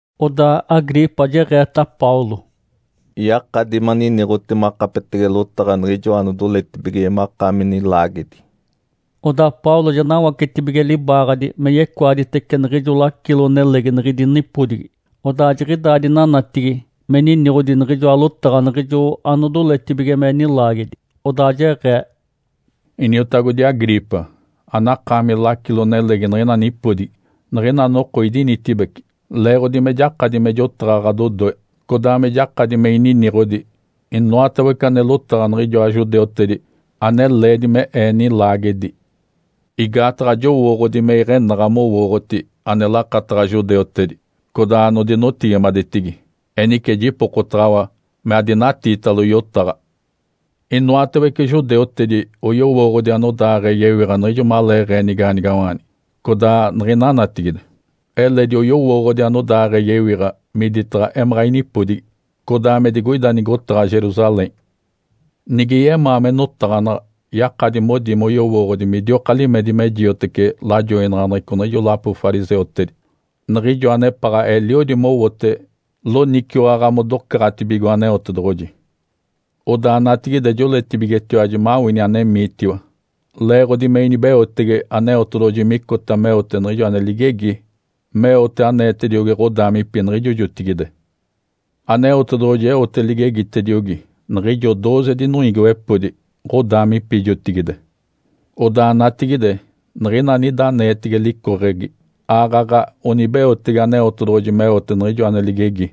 Odaa Agripa jeɡ̶eeta Paulo, “Yakadi maniniɡ̶oti makapetege lotaɡ̶a niɡ̶ijo anodoletibige makaami nilaagedi!” Odaa Paulo ja nawacetibige libaaɡ̶adi me yecoaditece niɡ̶ijo lacilo-nelegi niɡ̶idi nipodigi, odaa jiɡ̶idaa dinanatigi me niniɡ̶odi niɡ̶ijoa lotaɡ̶a niɡ̶ijo anodoletibige me nilaagedi. Odaa jeɡ̶ee, “Iniotagodi Agripa, anakaami lacilo-nelegi niɡ̶ina nipodigi. Niɡ̶ina noko idinitibeci leeɡ̶odi me jakadi me jotaɡ̶a ɡ̶adodoe, codaa me jakadi me ininiɡ̶odi inoatawece ane lotaɡ̶a niɡ̶ijoa judeutedi ane leedi me ee nilaagedi. Igaataɡ̶a jowooɡ̶odi me iɡ̶enaɡ̶a mowooɡ̶oti ane lakataɡ̶a judeutedi, codaa anodinotigimadetigi. Enice jipokotaɡ̶awa me adinatiitalo yotaɡ̶a. Inoatawece judeutedi oyowooɡ̶odi anodaaɡ̶ee yewiɡ̶a niɡ̶ijo maleeɡ̶ee nigaanigawaanigi codaa niɡ̶ina natigide. Eledi oyowooɡ̶odi anodaaɡ̶ee yewiɡ̶a miditaɡ̶a emaɡ̶a inipodigi, codaa me digoida nigotaɡ̶a Jerusalém. Nige yemaa me notaɡ̶anaɡ̶a, yakadi modi moyowooɡ̶odi midioka limedi me jioteci lajoinaɡ̶aneɡ̶eco niɡ̶ijo lapo fariseutedi, niɡ̶ijo anepaɡ̶a eliodi mowote loniciwaɡ̶a modocaɡ̶atibigo Aneotedoɡ̶oji. Odaa natigide joɡ̶oleetibigetiwaji mawini anemiitiwa leeɡ̶odi me inibeotege Aneotedoɡ̶oji micota meote niɡ̶ijo ane ligegi meote aneetediogi ɡ̶odaamipi niɡ̶ijo jotigide. Aneotedoɡ̶oji eote ligegitediogi niɡ̶ijo dooze dinoiigiwepodi ɡ̶odaamipi jotigide. Odaa natigide niɡ̶ina anida aneetege licoɡ̶egi aaɡ̶aɡ̶a onibeotege Aneotedoɡ̶oji meote niɡ̶ijo ane ligegi,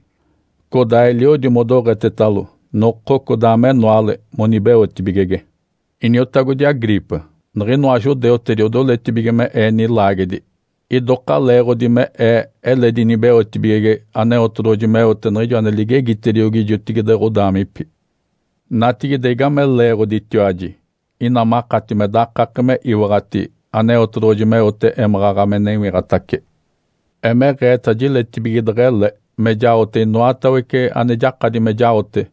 codaa eliodi modoɡ̶etetalo noko codaa menoale monibeotibigege. Iniotagodi Agripa, niɡ̶inoa judeutedi odoletibige me ee nilaagedi idoka leeɡ̶odi me ee eledi inibeotibigege Aneotedoɡ̶oji meote niɡ̶ijo ane ligegitediogi jotigide ɡ̶odaamipi. Natigide, igame leeɡ̶oditiwaji ina makati me dakake me iwaɡ̶ati Aneotedoɡ̶oji meote émaɡ̶aɡ̶a me newiɡ̶atace? Emeɡ̶eeta jiletibige deɡ̶ele me jaote inoatawece ane jakadi me jaote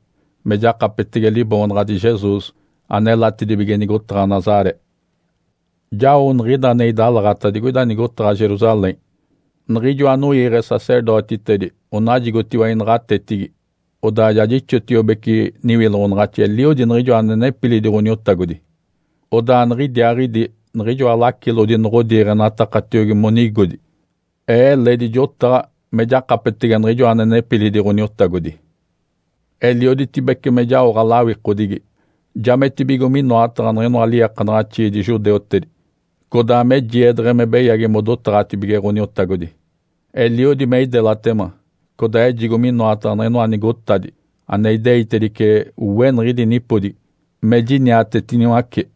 me jakapetege Liboonaɡ̶adi Jesus anelatedibige nigotaɡ̶a Nazaré. Jao niɡ̶ida ane idalaɡ̶ata digoida nigotaɡ̶a Jerusalém. Niɡ̶ijo anoiiɡ̶e sacerdotitedi onajigotiwa inaɡ̶atetigi, odaa ja jixotiobece niwiloɡ̶onaɡ̶axi eliodi niɡ̶ijo ane nepilidi Ǥoniotagodi. Odaa niɡ̶idiaaɡ̶idi niɡ̶ijoa lacilodi noɡ̶odiiɡ̶enatakatiogi monigodi, ee eledi jotaɡ̶a me jakapetege niɡ̶ijo ane nepilidi Ǥoniotagodi. Elioditibece me jaoɡ̶a lawikodigi, jametibigo minoataɡ̶a niɡ̶inoa liiakanaɡ̶axiidi judeutedi, codaa me jiedeɡ̶e me beyagi modotaɡ̶atibige Ǥoniotagodi. Eliodi me idelatema codaa ejigo minoataɡ̶a niɡ̶inoa nigotadi ane ideitedice we niɡ̶idi nipodigi me jiniatetiniwace.”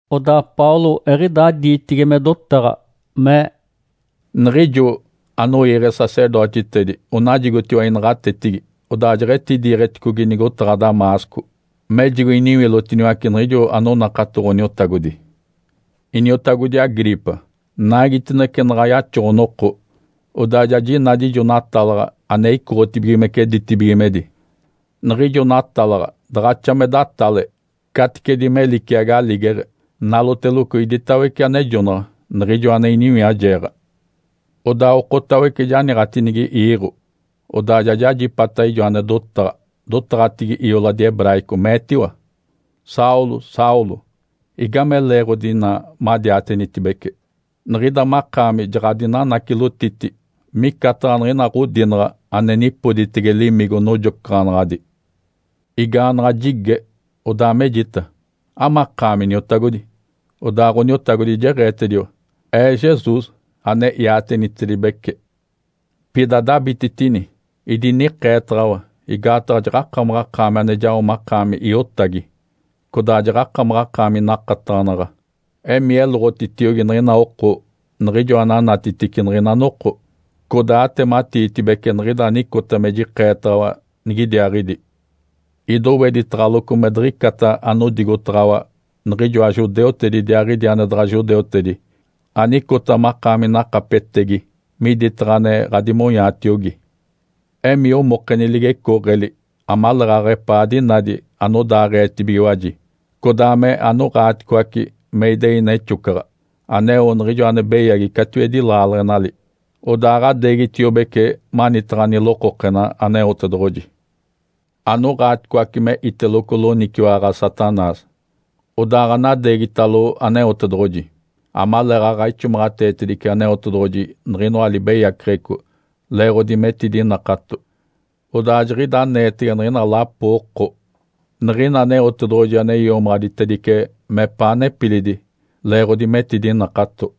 Odaa Paulo eɡ̶idaa diitigi me dotaɡ̶a, mee, “Niɡ̶ijo anoiiɡ̶e sacerdotitedi onajigotiwa inaɡ̶atetigi, odaa jeɡ̶etidiiɡ̶eticogi nigotaɡ̶a Damasco mejigo iniwilotiniwace niɡ̶ijo anonakato Ǥoniotagodi. Iniotagodi Agripa, naigitinece naɡ̶a yaxoɡ̶o-noko, odaa ja jinadi ijo natalaɡ̶a ane icoɡ̶otibigimece ditibigimedi. Niɡ̶ijo natalaɡ̶a daɡ̶axa me datale caticedi me liciagi aligeɡ̶e, naloteloco iditawece anejonaɡ̶a niɡ̶ijo ane iniwiajeeɡ̶a. Odaa okotawece janiiɡ̶atinigi iiɡ̶o, odaa ja jajipata ijo ane dotaɡ̶a, dotaɡ̶atigi ioladi hebraico, meetiwa, ‘Saulo! Saulo! Igame leeɡ̶odi ina madiatenitibece? Niɡ̶ida makaami ja ɡ̶adinanacilotiti micataɡ̶a niɡ̶ina ɡ̶odinaɡ̶a ane nipoditege limigo nojocaɡ̶anaɡ̶adi.’ Igaanaɡ̶a jige, odaa mejita, ‘Amakaami, Iniotagodi?’ Odaa Ǥoniotagodi jeɡ̶eetediwa, ‘Ee Jesus, ane iatenitedibece. Pida adabititini! Idinikeetaɡ̶awa igaataɡ̶a jaɡ̶akamaɡ̶akaami ane jao makaami iotagi, codaa jaɡ̶akamaɡ̶akaami nakataɡ̶anaɡ̶a. Emii eloɡ̶otitiogi niɡ̶ina oko niɡ̶ijo ananatitici niɡ̶ina noko, codaa atematiitibece niɡ̶ida anicota me jikeetaɡ̶awa nigidiaaɡ̶idi. Idoweditaɡ̶aloco me diɡ̶icata anodigotaɡ̶awa niɡ̶ijoa judeutedi idiaaɡ̶idi ane daɡ̶a judeutedi anicota makaami nakapetegi miditaɡ̶a ane ɡ̶adimonyaatiogi. Emii omokeni ligecooɡ̶eli amaleeɡ̶aɡ̶a epaa dinadi anodaaɡ̶eetibigiwaji, codaa me anoɡ̶aaticoace me idei nexocaɡ̶a aneo niɡ̶ijo ane beyagi catiwedi laaleɡ̶enali, odaaɡ̶adeegitiobece manitaɡ̶a nilokokena Aneotedoɡ̶oji. Anoɡ̶aaticoace me iteloco loniciwaɡ̶a Satanás, odaaɡ̶anadeegitalo Aneotedoɡ̶oji, amaleeɡ̶aɡ̶a ixomaɡ̶ateetedice Aneotedoɡ̶oji niɡ̶inoa libeyaceɡ̶eco leeɡ̶odi metidinakato, odaa jiɡ̶ida aneetege niɡ̶ina lapo oko niɡ̶ina Aneotedoɡ̶oji ane iomaɡ̶aditedice mepaa nepilidi leeɡ̶odi metidinakato.’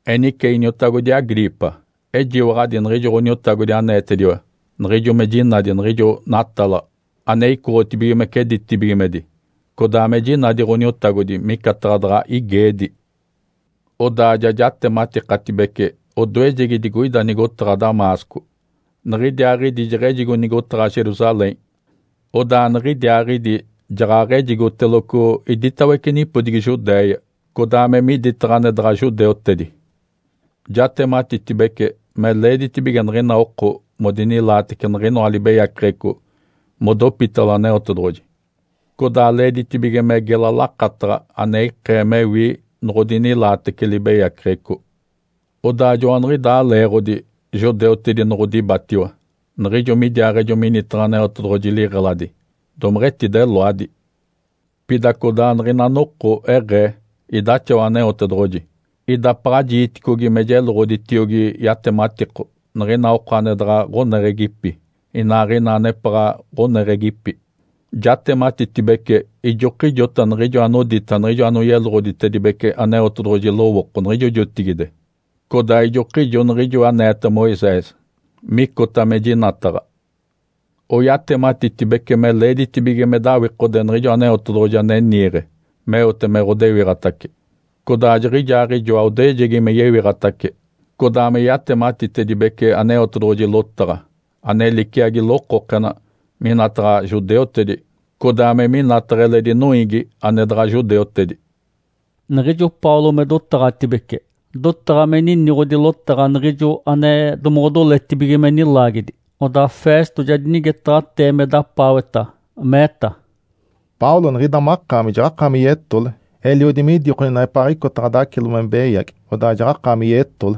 Enice iniotagodi Agripa, ejiwaɡ̶adi niɡ̶ijo Ǥoniotagodi aneetediwa niɡ̶ijo me jinadi niɡ̶ijo natalaɡ̶a ane icoɡ̶otibigimece ditibigimedi, codaa me jinadi Ǥoniotagodi micataɡ̶a daɡ̶a igeedi. Odaa ja jatematikatibece odoejegi digoida nigotaɡ̶a Damasco, niɡ̶idiaaɡ̶idi jeɡ̶ejigo nigotaɡ̶a Jerusalém, odaa niɡ̶idiaaɡ̶idi jaɡ̶aɡ̶ejigoteloco iditawece nipodigi Judéia codaa me miditaɡ̶a ane daɡ̶a judeutedi. Jatematitibece me leeditibige niɡ̶ina oko modinilaatece niɡ̶inoa libeyaceɡ̶eco modopitalo Aneotedoɡ̶oji, codaa leeditibige me gela lakataɡ̶a ane ikee mewi noɡ̶odinilaatece libeyaceɡ̶eco. Odaa joaniɡ̶idaa leeɡ̶odi judeutedi noɡ̶odibatiwa niɡ̶ijo midiaaɡ̶ejo minitaɡ̶a Aneotedoɡ̶oji liɡ̶eladi, domeɡ̶etideloadi. Pida codaa niɡ̶ina noko eɡ̶ee idaxawa Aneotedoɡ̶oji, idapaɡ̶a jiiticogi me jeloɡ̶oditiogi yatematiko niɡ̶ina oko ane daɡ̶a ɡ̶oneɡ̶egipi inaaɡ̶ina anepaɡ̶a ɡ̶oneɡ̶egipi. Jatematitibece ijokijota niɡ̶ijo anodita niɡ̶ijo anoyeloɡ̶oditedibece Aneotedoɡ̶oji lowooko niɡ̶ijo jotigide, codaa ijokijo niɡ̶ijo aneeta Moisés micota me jinataɡ̶a. Oyatematitibece me leeditibige me dawikode Niɡ̶ijo Aneotedoɡ̶oji ane niiɡ̶e meote me ɡ̶odewiɡ̶atace, codaa jiɡ̶ijaaɡ̶ijoa odoejegi me yewiɡ̶atace, codaa me yatematitedibece Aneotedoɡ̶oji lotaɡ̶a, ane liciagi lokokena, minataɡ̶a judeutedi codaa me minataɡ̶a eledi noiigi ane daɡ̶a judeutedi.” Niɡ̶ijo Paulo me dotaɡ̶atibece, dotaɡ̶a me niniɡ̶odi lotaɡ̶a niɡ̶ijo ane domoɡ̶odoletibige me nilaagedi, odaa Festo ja dinigetaɡ̶atee me dapaaweta, meeta, “Paulo, niɡ̶ida makaami jaɡ̶akaami yetole! Eliodi midikoni neɡ̶epaaɡ̶icota ɡ̶adacilo me beyagi, odaa jaɡ̶akaami yetole!”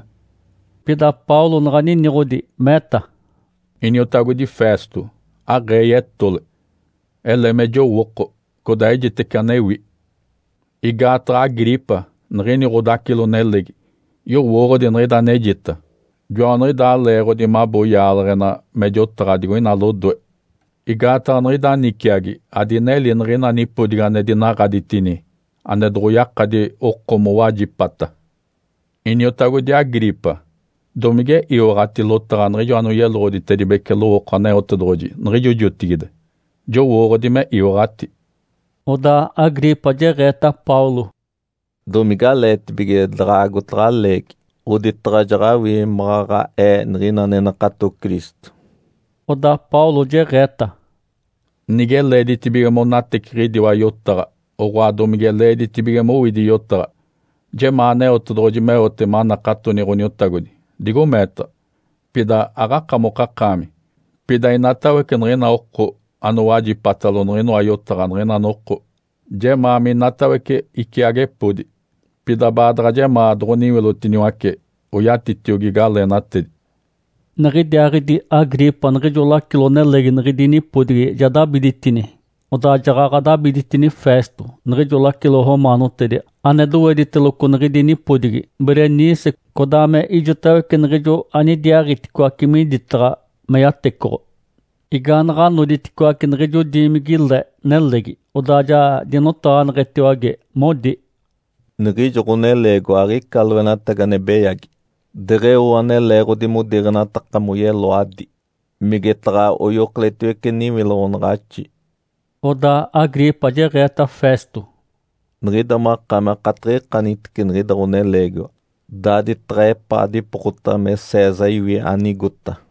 Pida Paulo naɡ̶a niniɡ̶odi, meeta, “Iniotagodi Festo, aɡ̶ee yetole. Ele me jowooko codaa ejitece anewi. Igaataɡ̶a Agripa niɡ̶ini ɡ̶odacilo-nelegi yowooɡ̶odi niɡ̶ida anejita. Joaniɡ̶idaa leeɡ̶odi mabo yaaleɡ̶ena me jotaɡ̶a digoina lodoe. Igaataɡ̶a niɡ̶ida niciagi adineli niɡ̶ina nipodigi ane dinaɡ̶aditini ane doɡ̶oyakadi oko mowajipata. Iniotagodi Agripa, domige iwaɡ̶ati lotaɡ̶a niɡ̶ijo anoyeloɡ̶oditedibece lowooko Aneotedoɡ̶oji niɡ̶ijo jotigide? Jowooɡ̶odi me iwaɡ̶ati!” Odaa Agripa jeɡ̶eeta Paulo, “Domigaleetibige daɡ̶a agotaɡ̶a leegi oditaɡ̶a jaɡ̶awii maɡ̶aɡ̶a ee niɡ̶ina ane nakato Cristo?” Odaa Paulo jeɡ̶eeta, “Nige leeditibige monateciɡ̶idiwa yotaɡ̶a, oɡ̶oa domige leeditibige mowidi yotaɡ̶a, jemaa Aneotedoɡ̶oji meote manakatoni Ǥoniotagodi digo meetaɡ̶a, pida aɡ̶akamokakaami, pida inatawece niɡ̶ina oko anowajipatalo niɡ̶inoa yotaɡ̶a niɡ̶ina noko. Jemaa minatawece iciagepodi, pida baadaɡ̶a jemaa doɡ̶oniwilotiniwace oyatitiogi galeenatedi!” Niɡ̶idiaaɡ̶idi Agripa niɡ̶ijo lacilo-nelegi niɡ̶idi nipodigi ja dabiditini. Odaa jaɡ̶aɡ̶a dabiditini Festo, niɡ̶ijo lacilo romaanotedi ane dowediteloco niɡ̶idi nipodigi, Berenice, codaa me ijotawece niɡ̶ijo anidiaaɡ̶iticoace miditaɡ̶a me yatecoɡ̶o. Igaanaɡ̶a noditicoaci niɡ̶ijo diimigi-le nelegi, odaa ja dinotaɡ̶aneɡ̶etiwage, modi, “Niɡ̶ijo ɡ̶oneleegiwa aɡ̶ica loenatagi ane beyagi deɡ̶eo ane leeɡ̶odi modiiɡ̶enataka moyeloadi migetaɡ̶a oyokoletiwece niwiloɡ̶onaɡ̶axi.” Odaa Agripa jeɡ̶eeta Festo, “Niɡ̶ida makaami akatiɡ̶ikanitice niɡ̶ida ɡ̶oneleegiwa daaditaɡ̶a epaa dipokota me César iwi anigota.”